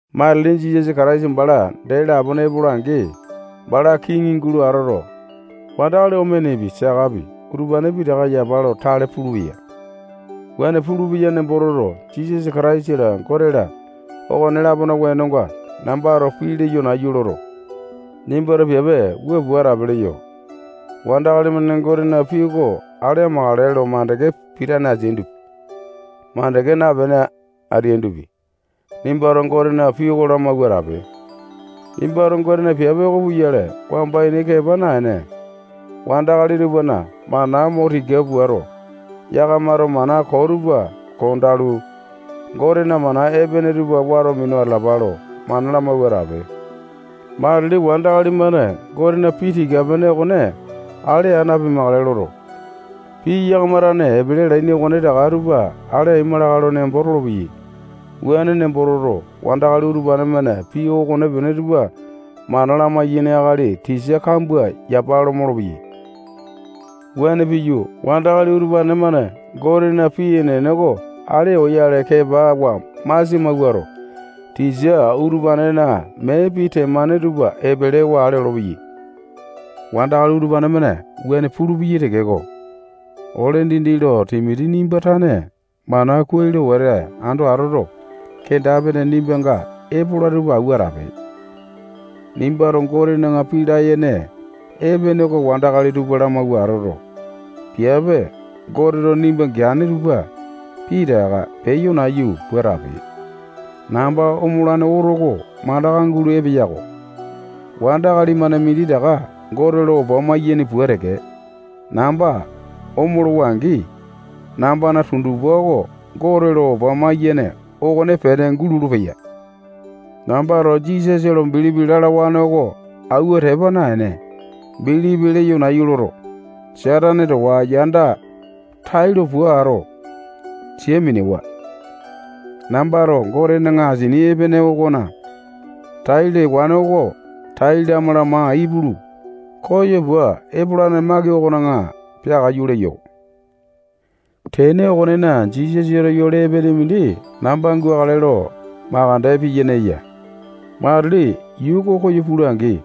Matili Jisasa Kataisa bala dee lapone epola-angi, bala kiŋi gulo atoto, wandakali omenepi, sakapi, utupane pitaka yapa lo tale pulupeya. Wuane pulupeya nembo toto, Jisasa Kataisa-la, Gote-la, okone-lapona wenonga nambato pii leyo nayu loto, nimbato piape wua pua atape leyo. Wandakali-mane Gotena pii oko ale amakale lo mandeke pitane ateaindopi, mandeke napene ateaindopi, nimbato Gotena pii oko lamawua atape. Nimbato Gotena piape oko puyale wamba ini kepa naene, wandakali tupana mana mo tika puato, yakamato mana koo tupa kondalu, Gotena mana epene tupa wato minu atalapa lo mana lamawua atape. Matili wandakali-mane Gotena pii tika-pene okone ale aa napimakale loto, pii yakama tane epele alaini okonetaka tupa ale aima lakae lo nembo tolopeyai. Wuane nembo toto, wandakali utupane-mane pii okonepene tupa mana lamai-yaini akali tisa kambua yapa lo molopeyai. Wuane piyu, wandakali utupane-mane Gotena pii enene oko ale oyale kepawa masia mawuato, tisa utupanena mee pii temane tupa epelewa ale olopeyai. Wandakali utupane-mane wuane pulupeyai tekeko, ole dindi lo Timoti nimba tane mana kuai lo wete ando atoto, kenda-pene nimbanga epola tupa awua atape. Nimbato Gotena pii layene epene oko wandakali tupa lamawua atoto, piape Goteto nimba geane tupa pitaka peyo nayu pua atape. Namba omolane oto oko mandaka gulo epeya-ko. Wandakali-mane minditaka Gote lo opa maiyaini pua teke, namba omolowa-angi, nambana tundupa oko Gote lo opa maiyene okonepene gulolo-peya. Nambato Jisasa lo bilipi lalawane oko awua tepa naene, bilipi leyo nayu loto, Satane towa yanda tailo puato, sia minewa. Nambato Gotena asini epene okona tai lewane oko tai lama-lama ipulu, koyo pua epolane maki okona peakaiyu leyo. Tene okonena, Jisasato yole epene mindi namba gukale lo makande piyene eya. Matili yuu oko koyo pula-angi,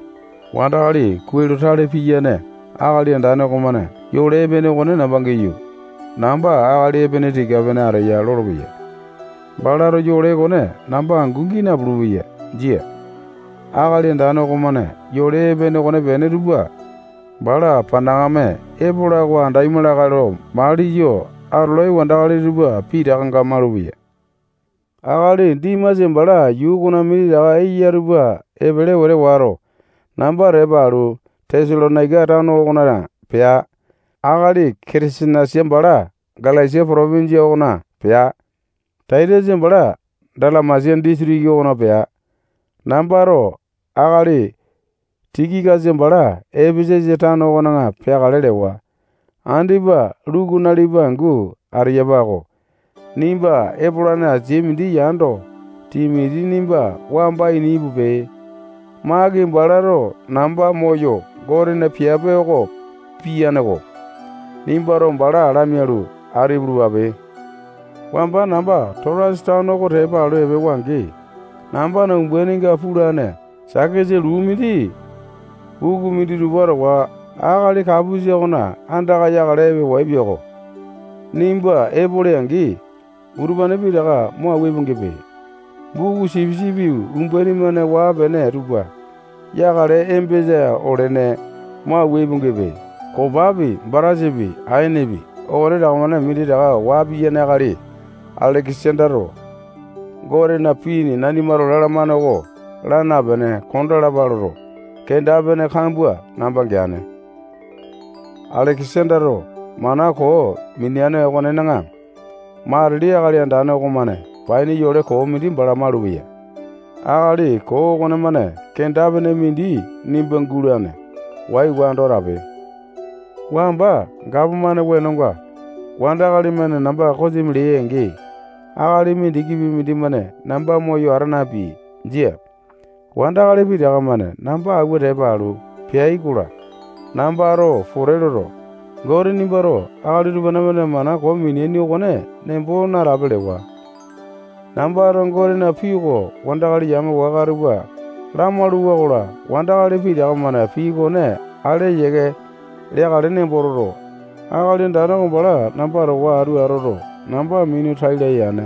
wandakali kuai lo tale piyane Akali Andane okomane yole epene okone namba giyu, namba akali epene tika-pene ateya lolopeya. Balato yole okone namba angu gii napulu-peya. Jia. Akali Andane okomane yole epene okonepene tupa bala panakame epola oko andaima lakae lo maliyo atolai wandakali tupa pitakanga malupeya. Akali Dimasa bala yuu okona minditaka eya tupa epele wete wato, namba tepa alu, Tesalonaika tano okona pea. Akali Ketesenasa bala Galesia potopinjia okona pea. Taitasa bala Dalamesia disitiki okona pea. Nambato akali Tikikasa bala Epesasa tano okona peakale lewa. Andipa Luku nalipa angu ateyapa-ko. Nimba epolane asia mindi yando, Timoti nimba wamba ini ipupe. Maki balato namba moyo Gotena piape oko piyane-ko. Nimbato bala lamialu, atu ipulupape. Wamba namba Totasa tano oko tepa alu epewa-angi, nambana umbaininga pulane sakesa luu mindi buku minditupa towa akali Kapusa okona andaka yakale epewaepia-ko. Nimba epole-angi, utupane pitaka mo awua ipu-gipe. Buku sipisipi umbaini-mane waa-pene tupa yakale embesa olene. Mo awua ipu-gipe. Kopapi, batasapi, aenepi, okonetaka-mane minditaka waa piyane akali Aleke-sandato Gotena pii nanimato lalamane oko laa napene kondalapa loto, kenda-pene kambua namba geane. Aleke-sandato mana koo minia okonena, matili Akali Andane okomane paini yole koo mindi bala malupeya. Akali koo okonemane kenda-pene mindi nimba gulane. Waiwa ando atape. Wamba gapomane wenonga wandakali-mane namba kosimi leai-angi, akali mindikipi mindimane namba moyo ata napeai. Jia. Wandakali pitaka-mane namba awua tepa alu, peai-kola, nambato pote loto, Gote nimbato akali utupane-mane mana koo mineaini okone nembo natape lewa. Nambato Gotena pii oko wandakali yame waka tupa lamalu-wakola, wandakali pitaka-mane pii okone ale yiake leakale nembo toto, Akali Andane oko bala namba towa atu atoto, namba minu tai laya yane.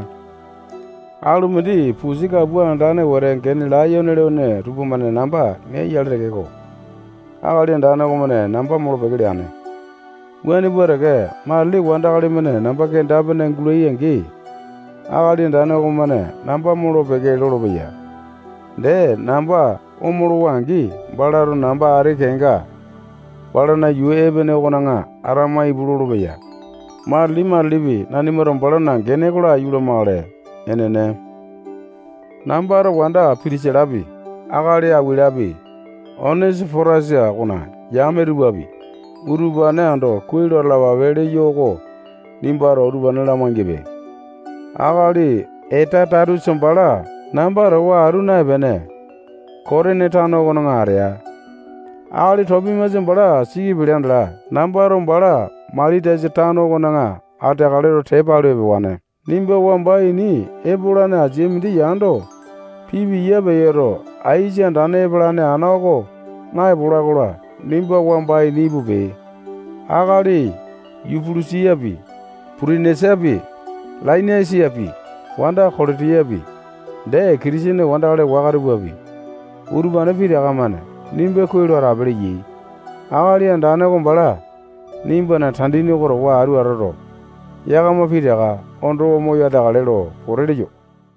Alu mindi pusi kapua andane wete gene layone lene tupamane namba neai-yale tekeko, Akali Andane okomane namba molo-peke leane. Wuane pua teke, matili wandakali-mane namba kenda-pene gulai-angi, Akali Andane okomane namba molo-peke lolopeya. Dee, namba omolowa-angi, balato namba ati kenga balana yuu epene okona atama ipu lolopeya. Matili-matilipi nanimato balana gene oko laiyu lamakale. Enene. Nambato wanda Pitisilapi, akali Akuwilapi, Onesi-potasa okona yame tupapi, utupane ando kuai lo atalapape leyo oko nimbato utupane lamai-gipe. Akali Etasatusa bala namba towa atu naepene, Kotini tano okona atea. Akali Topimasa bala siki pelea andala, nambato bala Mailitasa tano okona ateakale lo tepa alu epewane. Nimba wamba ini epolane asia mindi yando, pipiya peyoto, aisa andane epalane ana oko naepola-kola, nimba wamba ini ipupe. Akali Yupulusapi, Putenesapi, Lainasapi, wanda Kolotiyapi, dee Kitisene wandakali waka tupapi, utupane pitaka-mane nimba kuai lo atape leyai. Akali Andane oko bala nimbana tandini oko towa atu atoto, yakama pitaka ondowa moyo ateakale lo pote leyo.